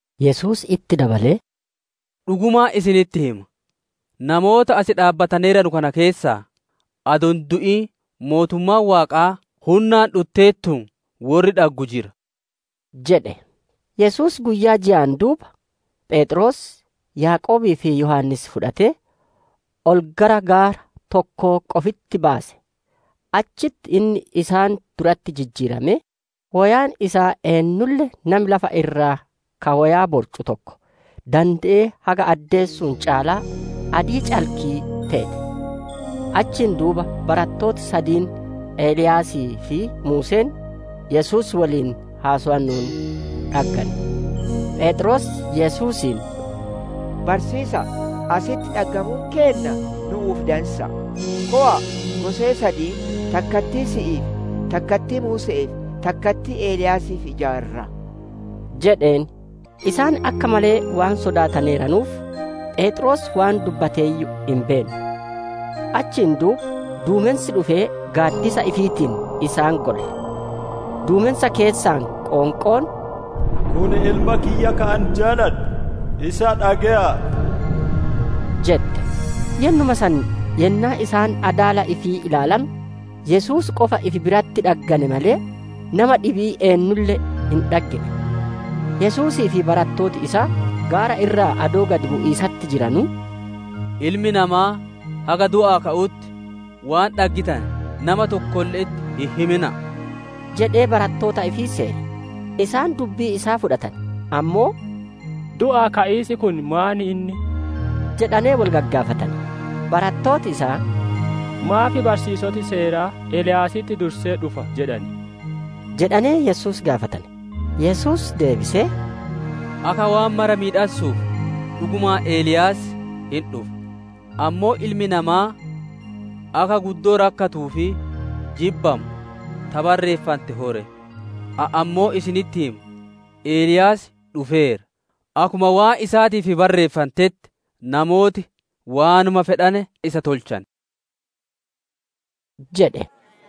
Yesuus itti dabalee, «Dhugumaan isinitti hima; namoota as dhaabbataneeranu kana keessaa, adoo hin du'in mootummaan Waaqaa, hunnaan dhutteertuun worri dhaggu jira» jedhe. Yesuus guyyaa jaan duuba, Pheexroos, Yaaqoobii fi Yohaannis fudhatee, ol gara gaara tokkoo qofitti baase. Achitti inni isaan duratti jijjiiramee, woyaan isaa eennulle nami lafa irraa ka woyaa borcu tokko dande'ee haga addeessuun caalaa adii calkii teete. Achiin duuba barattooti sadiin Eliyaasii fi Muuseen Yesuus woliin haasowanuun dhaggane. Pheexroos Yesuusiin, «Barsiisa'a! Asitti dhaggamuun keenna nu'uuf dansa'a! Kowa'a gosee sadiin, takkattii si'iif, takkattii Muuse'eef, takkattii Eliyaasiif ijaarraa» jedheen. Isaan akka malee waan sodaataneeranuuf, Pheexroos waan dubbateeyyuu hin beenne. Achiin duuba duumensi dhufee gaaddisa ifiitiin isaan golle. Duumensa keessaa qoonqoon, «Kun Ilma kiyya ka an jaaladhu, isa dhage'aa!» jette. Yennuma san yennaa isaan adaala ifii ilaalanu Yesuus qofa ifi biratti dhaggane malee, nama dhibii eennulle hin dhaggine. Yesuusii fi barattooti isaa gaara irraa adoo gad bu'iisatti jiranuu, «Ilmi namaa haga du'aa ka'utti waan dhaggitane, nama tokkolle'etti hin himina'a» jedhee barattoota ifii seere. Isaan dubbii isaa fudhatane; ammoo, «Du'aa ka'iis kun maan inni?» jedhanee wol gagaafatane. Barattooti isaa, «Maaf barsiisoti seeraa, ‹Eliyaasitti dursee dhufa› jedhan?» jedhanee Yesuus gaafatane. Yesuus deebisee, «Akka waan mara miidhassuuf dhugumaan Eliyaas hin dhufa; ammoo Ilmi Namaa akka guddoo rakkatuu fi jibbamuu ta barreeffante ho ree? Ani ammoo isinitti hima; Eliyaas dhufeera; akkuma waan isaatiif barreeffantetti, namooti waanuma fedhane isa tolchane» jedhe.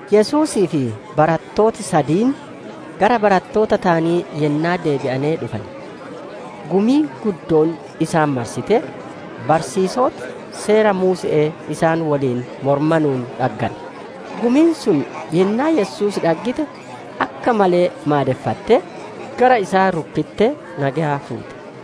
Yesuusii fi barattooti sadiin, gara barattoota taanii yennaa deebi'anee dhufane, gumiin guddoon isaan marsitee, barsiisoti Seera Muuse'ee isaan woliin moromanuun dhaggane. Gumiin sun yennaa Yesuus dhaggite, akka malee maadeffattee, gara isaa rukkittee nageya fuute.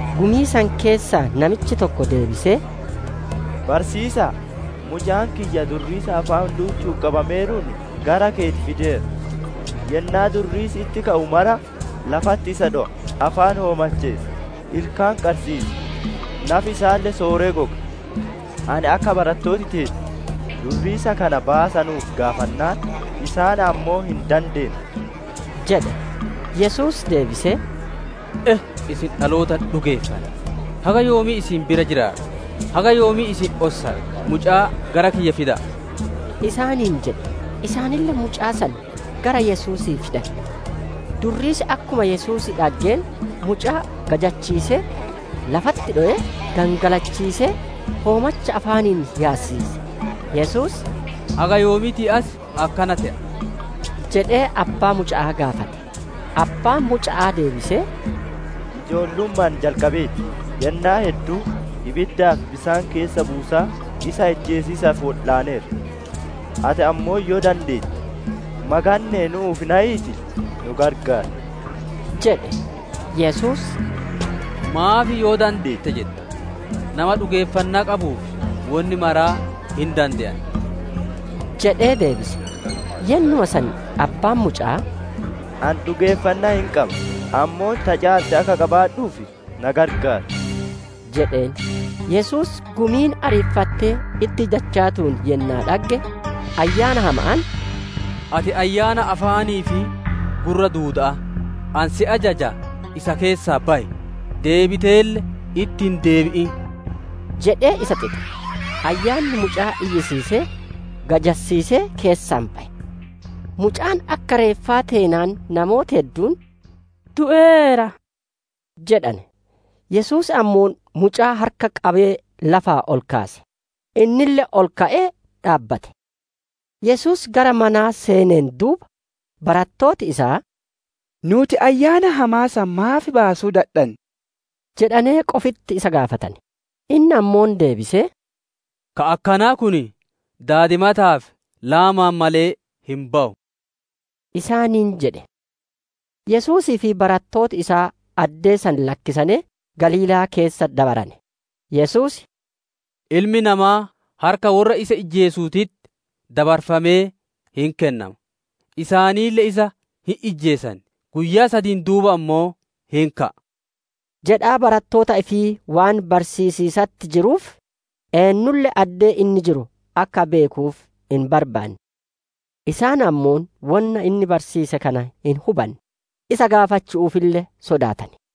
Gumii san keessaa namichi tokko deebisee, «Barsiisa'a! Mucaan kiyya durriisa afaan duuchuun qabameeruun gara keeti fideera. Yennaa durriisi itti ka'u mara lafatti isa dhowa; afaan hoomacheessa, ilkaan qarsiisa, nafi isaalle sooree goga. Ani akka barattooti teeti durriisa kana baasanuuf gaafannaan, isaan ammoo hin dandeenne» jedhe. Yesuus deebisee, «E! Isin dhaloota hin dhugeeffanne! Haga yoomii isin bira jiraadha? Haga yoomii isin ossadha? Mucaa gara kiyya fida'a!» isaaniin jedhe. Isaanille mucaa san gara Yesuusii fidane. Durriisi akkuma Yesuus dhaggeen, mucaa gajassiisee, lafatti dhowee, gangalachiisee, hoomacha afaanii yaasisiise. Yesuus, «Haga yoomiitii as akkana te'a?» jedhee abbaa muca'aa gaafate. Abbaan muca'aa deebisee, «Ijoolluma'aan jalqabee ti. Yennaa hedduu ibiddaa fi bisaan keessa buusaa isa ijjeesiisaaf wodhaaneera. Ati ammoo yoo dandeette, maganne'ee nu'uuf nayiitii nu gargaar» jedhe. Yesuus, «Maaf ‹Yoo dandeette› jetta? Nama dhugeeffannaa qabuuf wonni marti hin dande'anti» jedhee deebise. Yennuma san abbaan muca'aa, «Ani dhugeeffannaa hin qaba. Ammoo ta caalte akka qabaadhuuf na gargaar!» jedheen. Yesuus gumiin ariifattee itti dachaatuun yennaa dhagge, ayyaana hama'aan, «Ati ayyaana afaanii fi gurra duuda'aa! Ani si ajajaa isa keessaa bayi; deebiteelle itti hin deebi'in» jedhee isa xixe. Ayyaanni mucaa iyyisiisee, gajassiisee keessaa baye. Mucaan akka reeffaa teenaan, namooti hedduun, «Du'eera» jedhane. Yesuus ammoo mucaa harka qabee lafaa ol kaase; innille ol ka'ee dhaabbate. Yesuus gara manaa seeneen duuba, barattooti isaa, «Nuuti ayyaana hamaa san maaf baasuu dadhanne?» jedhanee qofitti isa gaafatane. Inni ammoo deebisee, «Ka akkanaa kun daadimataa fi laamaan malee hin bawu» isaaniin jedhe. Yesuusii fi barattooti isaa addee san lakkisanee Galiilaa keessa dabarane. Yesuus, «Ilmi Namaa harka worra isa ijjeesuutitti dabarfamee hin kennama; isaanille isa hin ijjeesan; guyyaa sadiin duuba ammoo hin ka'a» jedhaa barattoota ifii waan barsiisiisatti jiruuf, eennulle addee inni jiru akka beekuuf hin barbaanne. Isaan ammoo wonna inni barsiise kana hin hubanne; isa gaafachu'uufille sodaatane.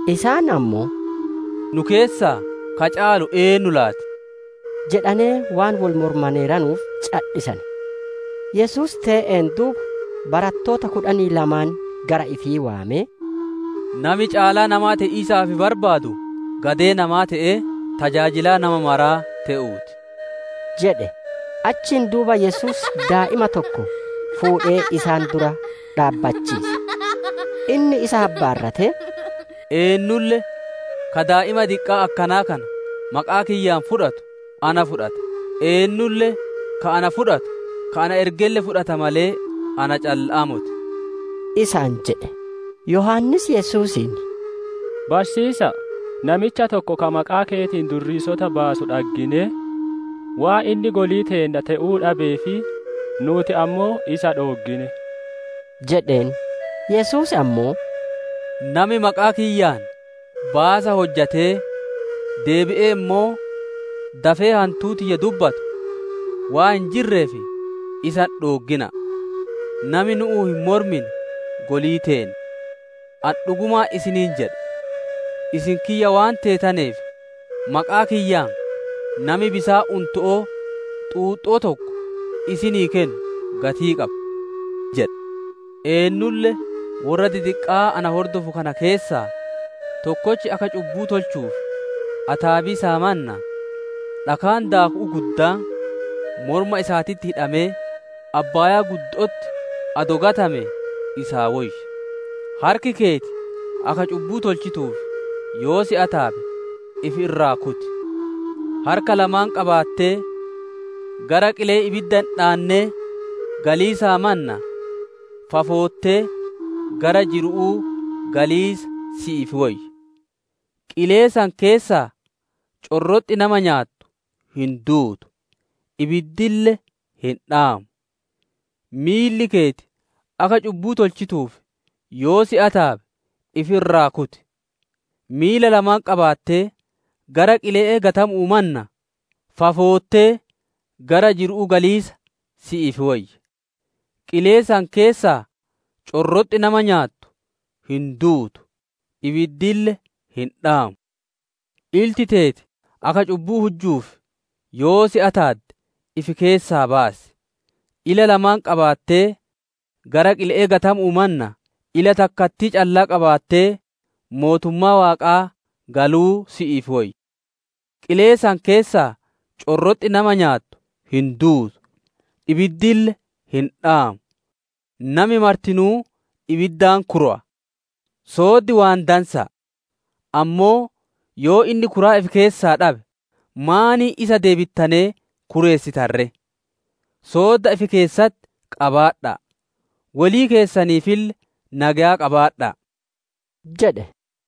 Isaan ammoo, «Nu keessaa ka caalu eennu laati?» jedhanee waan wol moromaneeranuuf cadhisane. Yesuus tee'een duuba barattoota kudhanii lamaan gara ifii waamee, «Nami caalaa namaa te'iisaaf barbaadu, gadee namaa te'ee, tajaajilaa nama maraa te'uu ti» jedhe. Achiin duuba Yesuus daa'ima tokko fuudhee isaan dura dhaabbachiise. Inni isa habbaarratee, «Eennulle ka daa'ima diqqaa akkanaa kana maqaa kiyyaan fudhatu, na fudhata; eennulle ka ana fudhatu, ka na ergelle fudhata malee na calla'aa moti» isaan jedhe. Yohaannis Yesuusiin, «Barsiisa'a, namicha tokko, ka maqaa keetiin durriisota baasu dhagginee, waan inni golii teenna te'uu dhabeef, nuuti ammoo isa dhooggine» jedheen. Yesuus ammoo, «Nami maqaa kiyyaan baasa hojjatee deebi'ee ammoo, dafee hantuu tiyya dubbatu waan hin jirreef, isa hin dhooggina'a. Nami nu'uun hin mormine golii teenna. Ani dhugumaan isiniin jedha, isin kiyya waan teetaneef, maqaa kiyyaan nami bisaan unto'oo xuuxxoo tokko isinii kennu gatii qaba. «Eennulle worra didiqqaa na hordofu kana keessaa tokkochi akka cubbuu tolchanuuf ataabiisaa mannaa, dhakaan daaku'uu guddaan morma isaatitti hidhamee abbaayaa guddo'otti adoo gatamee isaa woyya. Harki keeti akka cubbuu tolchituuf, yoo si ataabe ifi irraa kuti; harka lamaan qabaattee gara qilee ibidda hin dhaannee galiisaa mannaa, fafoottee gara jiru'uu galiisa si'iif woyya. [ Qilee san keessaa corroxxi nama nyaattu hin duutu; ibiddille hin dhaamu.] Miilli keeti akka cubbuu tolchituuf, yoo si ataabe ifi irraa kuti; miila lamaan qabaattee gara qile'ee gatamu'uu mannaa, fafoottee gara jiru'uu galiisa si'iif woyya. [ Qilee san keessaa corroxxi nama nyaattu hin duutu; ibiddille hin dhaamu.] Ilti teeti akka cubbuu tolchituuf yoo si ataadde ifi keessaa baasi; ila lamaan qabaattee gara qile'ee gatamu'uu mannaa, ila takkattii callaa qabaattee mootummaa Waaqaa galuu si'iif woyya. Qilee san keessaa corroxxi nama nyaattu hin duutu; ibiddille hin dhaamu. Nami martinuu ibiddaan kurowa. «Sooddi waan dansa'a; ammoo yoo inni kuraa ifi keessaa dhabe, maaniin isa deebittanee kureessitan ree? «Soodda ifi keessatti qabaadha'a; wolii keessaniifille nageya qabaadha'a!» jedhe.